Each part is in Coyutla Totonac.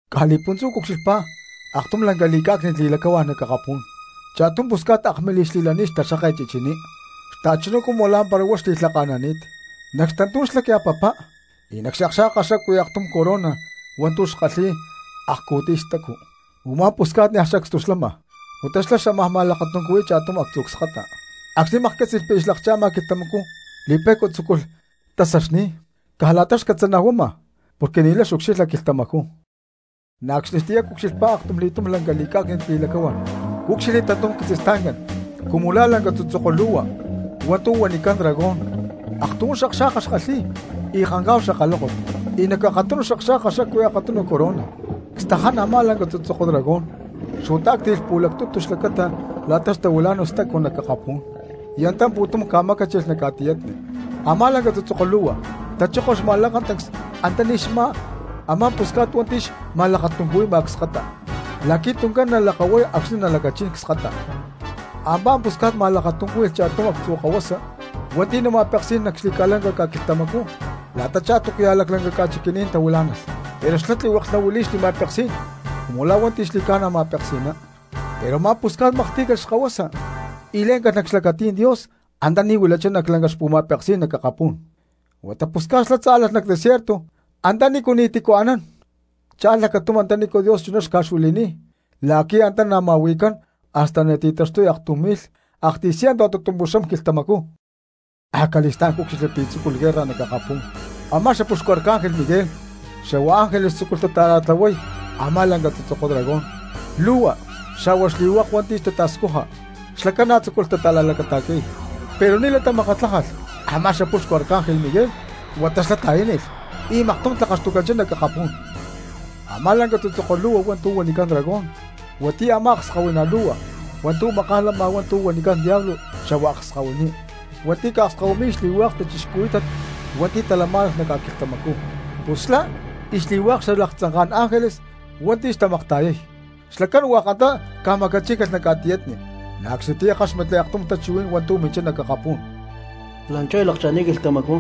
Caj li̠puntzú cucxilhpá aktum lanca li̠cá̠cni̠t li̠lacahuá̠n nac akapú̠n: cha̠tum pusca̠t akmilij xli̠lani̠t xtaxkáket chichiní xta̠chuná cumu lá̠mpara huá xli̠lhaka̠nani̠t; nac xtantú̠n xlacya papá y nac xakxa̠ka xacuí aktum corona hua̠ntu̠ xkalhi̠y akcu̠tiy stacu. Umá pusca̠t niaj sacstu xlama huata xlá xámaj ma̠lakatuncuhui̠y cha̠tum actzu̠ cskata. Acxni̠ maklhcátzi̠lh pi̠ aya lakcha̠ma quilhtamacú li̠pe̠cua tzúculh tasaxni̠y caj la̠ta xcatzanajuama porque ni̠lay xucxilha quilhtamacú. Na̠ acxnitiyá cucxilhpá aktumli̠túm lanca li̠cá̠cni̠t li̠lacahuá̠n, cúcxilhli tantum quitzistancán cumu la̠ lanca tzutzoko lu̠hua hua̠ntu̠ huanicán dragón, aktujún xakxa̠ka xkalhi̠y y kancá̠hu xakalókot, y nac akatunu xakxa̠ka xacuí akatunu corona. Cstaján a̠má lanca tzutzoko dragón xuataácti̠lh pu̠lactutu xlacata la̠ta tahuilá̠nalh stacu nac akapú̠n y antá pu̠tum ca̠macáchilh nac ca̠tiyatni. Amá lanca tzutzoko lu̠hua tachókolh xma̠lakatancs antaní xmá a̠má pusca̠t hua̠nti̠ xma̠lakatuncuhui̠ma cskata, la̠qui̠ tuncán nalakahuay acxni̠ nalacachín cskata. Amá pusca̠t ma̠lakatuncúhui̠lh cha̠tum actzu̠ kahuasa hua̠nti̠ nama̠peksi̠nán nac xli̠ca̠lanca ca̠quilhtamacú la̠tachá túcuya̠ laclanca ca̠chiqui̠ní̠n tahuilá̠nalh, pero xlá tlihueklh nahuili̠y xli̠ma̠peksí̠n cumu la̠ hua̠nti̠ xli̠ca̠na ma̠peksi̠ná. Pero a̠má pusca̠t maklhtí̠calh xkahuasa y lé̠ncalh nac xlacatí̠n Dios antaní huilachá nac lanca xpu̠ma̠peksí̠n nac akapú̠n. Huata pusca̠t xlá tzálalh nac desierto antanícu ni̠tícu anán, cha̠lh lacatum antanícu Dios chuná xca̠xuili̠nini̠t la̠qui̠ antá nama̠hui̠cán hasta nati̠taxtuy aktum mi̠lh aktiy cientu a̠tutumpuxam quilhtamacú. Acali̠stá̠n cúcxilhli pi̠ tzúculh guerra nac akapú̠n, a̠má xapuxcu ángel Miguel xa̠hua xángeles tzúculh tata̠ra̠tlahuay a̠má lanca tzutzoko dragón lu̠hua xa̠hua xli̠hua̠k hua̠nti̠ tata̠scuja, xlacán na̠ tzúculh tata̠la̠lacata̠qui̠y. Pero ni̠lay tamakatlájalh a̠má xapuxcu ángel Miguel, huata xlá ta̠yánilh y maktum tlakaxtucanchá nac akapú̠n. Amá lanca tzutzoko lu̠hua hua̠ntu̠ huanicán dragón, huatiyá a̠má akskahuiná lu̠hua hua̠ntu̠ maká̠n lama hua̠ntu̠ huanicán Diablo xa̠hua Akskahuiní, hua̠nti̠ xca̠akskahuiy xli̠hua̠k cristianos hua̠nti̠ talamá̠nalh nac ca̠quilhtamacú, pus xlá y xli̠hua̠k xalaktzanká̠n ángeles hua̠nti̠ xtamakta̠yay, xlacán hua̠k antá ca̠macachíncalh nac ca̠tiyatni. Na̠ acxnitiyá ckáxmatli aktum tachuhuí̠n hua̠ntu̠ minchá nac akapú̠n: La̠nchú aya lakcha̠ni̠t quilhtamacú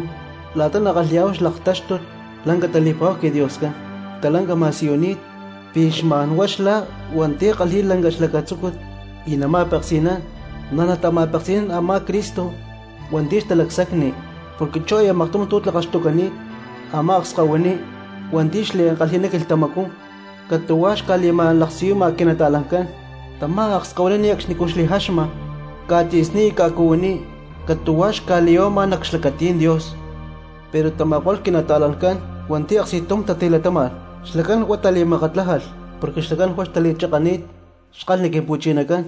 la̠ta nakalhi̠yá̠hu xlaktáxtut lanca tali̠pa̠hu quiDioscán, stalanca ma̠siyuni̠t pi̠ xma̠n huá xlá hua̠nti̠ kalhi̠y lanca xlacatzúcut y nama̠peksi̠nán, na̠ nata̠ma̠peksi̠nán a̠má Cristo hua̠nti̠ xtalacsacni. Porque chú aya maktum tu̠ tlakaxtucani̠t a̠má akskahuiní hua̠nti̠ xliankalhi̠ná quilhtamacú catu̠huá xca̠li̠ma̠laksiyuma quinata̠lancán. Tamá akskahuiní ne̠cxnicú xli̠jaxma ca̠tzi̠sní y ca̠cuhuiní catu̠hua xca̠li̠ya̠huama nac xlacatí̠n Dios. Pero tama̠ko̠lh quinata̠lancán hua̠nti̠ aksti̠tum tatilatáma̠lh, xlacán huá tali̠makatlájalh, porque xlacán huá xtali̠chakani̠t xkalhni Quimpu̠chinacán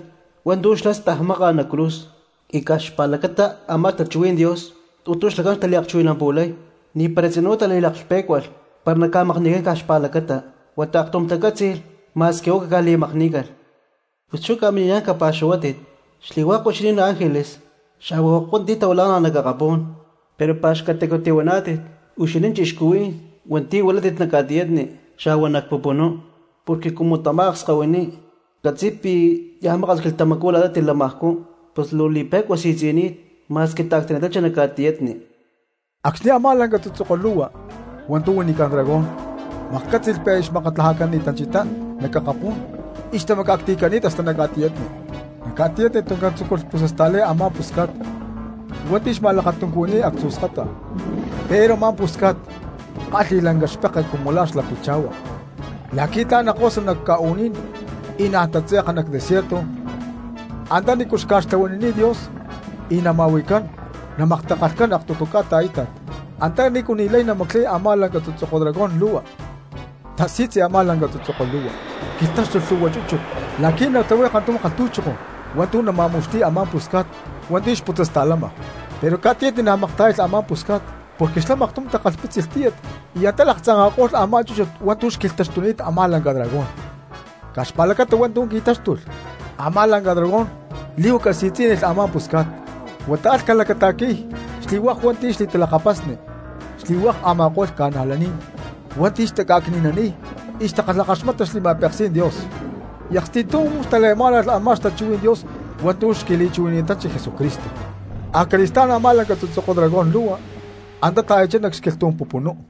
hua̠ntu̠ xlá stajmákalh nac cruz, y caj xpa̠lacata a̠má xtachuhuí̠n Dios hua̠ntu̠ xlacán xtaliakchuhui̠nampu̠lay. Ni̠para tzinú tali̠laklhpé̠cualh para naca̠makni̠cán caj huá xpa̠lacata, huata aktum tacátzi̠lh ma̠squi huá caca̠li̠makní̠calh. ¡Pus ca̠mini̠niyá̠n capa̠xuhuátit xli̠hua̠k huixinín ángeles xa̠hua hua̠k hua̠nti̠ tahuilá̠nalh nac akapú̠n! ¡Pero pa̠xcatacu tihuaná̠tit huixinín cristianos hua̠nti̠ huilátit nac ca̠tiyatni, xa̠hua nac pupunú, porque cumu tamá akskahuiní catzi̠y pi̠ niaj maka̠s quilhtamacú la̠ta tilamajcú, pus luu li̠pe̠cua si̠tzi̠ni̠t ma̠squi ta̠ctani̠tanchi nac ca̠tiyatni! Acxni̠ a̠má lanca tzutzoko lu̠hua hua̠ntu̠ huanicán dragón maklhcátzi̠lh pi̠ xmakatlajacani̠tanchá nac akapú̠n y xtamaca̠cti̠cani̠t hasta nac ca̠tiyatni, nac ca̠tiyatni tuncán tzúculh putzasta̠lay a̠má pusca̠t hua̠nti̠ xma̠lakatuncuhui̠ni̠t actzu̠ cskata. Pero a̠má pusca̠t kálhi̠lh lanca xpeke cumu la̠ xla picha̠hua la̠qui̠ tla̠n nakosa nac ca̠u̠ní̠n y naán tatze̠ka nac desierto antanícu xca̠xtlahuanini̠t Dios y nama̠hui̠cán y namaktakalhcán aktutu ca̠ta a̠íta̠t, antanícu ni̠lay namaclay a̠má lanca tzutzoko dragón lu̠hua. Xtasi̠tzi a̠má lanca tzutzoko lu̠hua quilhtáxtulh lhu̠hua chúchut la̠qui̠ natlahuay kantum kalhtu̠choko hua̠ntu̠ nama̠mu̠xti̠y a̠má pusca̠t hua̠nti̠ xputzasta̠lama. Pero ca̠tiyatni na̠ maktá̠yalh a̠má pusca̠t porque xlá maktum takalhpítzilh tíyat y antá laktzanka̠ko̠lh a̠má chúchut hua̠ntu̠ xquilhtaxtuni̠t a̠má lanca dragón. Caj xpa̠lacata hua̠ntu̠ qui̠táxtulh a̠má lanca dragón li̠huaca si̠tzí̠nilh a̠má pusca̠t, huata alh ca̠lacata̠qui̠y xli̠hua̠k hua̠nti̠ xli̠talakapasni, xli̠hua̠k a̠ma̠ko̠lh cristianos hua̠nti̠ taca̠cni̠naniy y takalhakaxmata xli̠ma̠peksí̠n Dios, y aksti̠tum tali̠lamá̠nalh a̠má xtachuhuí̠n Dios hua̠ntu̠ tiqui̠li̠chuhui̠nanchi Jesucristo. Acali̠stá̠n a̠má lanca tzutzoko dragón lu̠hua antá ta̠yachá nac xquilhtú̠n pupunú.